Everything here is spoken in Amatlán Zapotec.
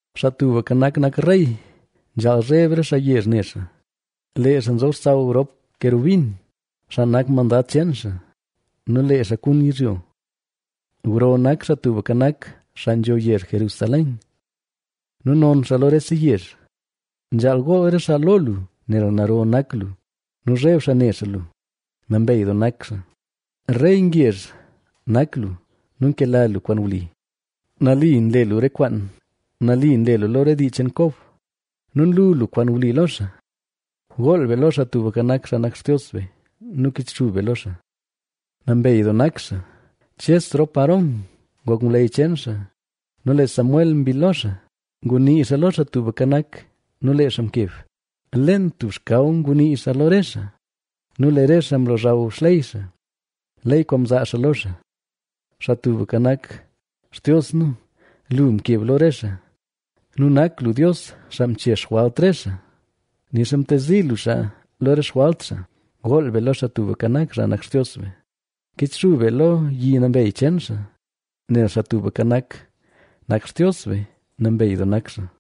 Xaa Tubka Nak, nak rey; nzhaal zheb re xaa yezh ne xaa. Lee xaa nzob xsaw rop kerubin, xaa nak mandad cheen xaa nu lee xaa kun yizhyo. Gro nak Xaa Tubka Nak, xaa nzho yezh Jerusalén, nu non xaa lo rese yezh. Nzhaal gool re xaa lo lu nel naro nak lu nu zheb xaa ne xaa lu. ¡Nambey doo nak xaa! Rey ngezh nak lu nu nkela lu kwaan wli. Nali nle lu re kwaan; nali nle lu lo re dii cheen Kob nu nlu lu kwaan wli lo xaa. Gool be lo Xaa Tubka Nak, xaa nak Xtios be nu kichxub be lo xaa. ¡Nambey doo nak xaa! Ches rop Aarón ngok ngwleyy cheen xaa nu lee Samuel mbill lo xaa; ngunii xaa lo Xaa Tubka Nak, nu lee xaa mkeb. Leen tub xkaw ngunii xaa lo re xaa; nu lee re xaa mlozhaw xley xaa, ley kwaan mzaa xaa lo xaa. Xaa Tubka Nak, Xtios nu, lu mkeb lo re xaa; nu nak lu Dios xaa mche xjwalt re xaa, nixa mtezi lu xaa lo re xjwalt xaa. Gool be lo Xaa Tubka Nak, xaa nak Xtios be, kichxub be lo yi nambey cheen xaa, nel Xaa Tubka Nak, nak Xtios be, ¡Nambey doo nak xaa!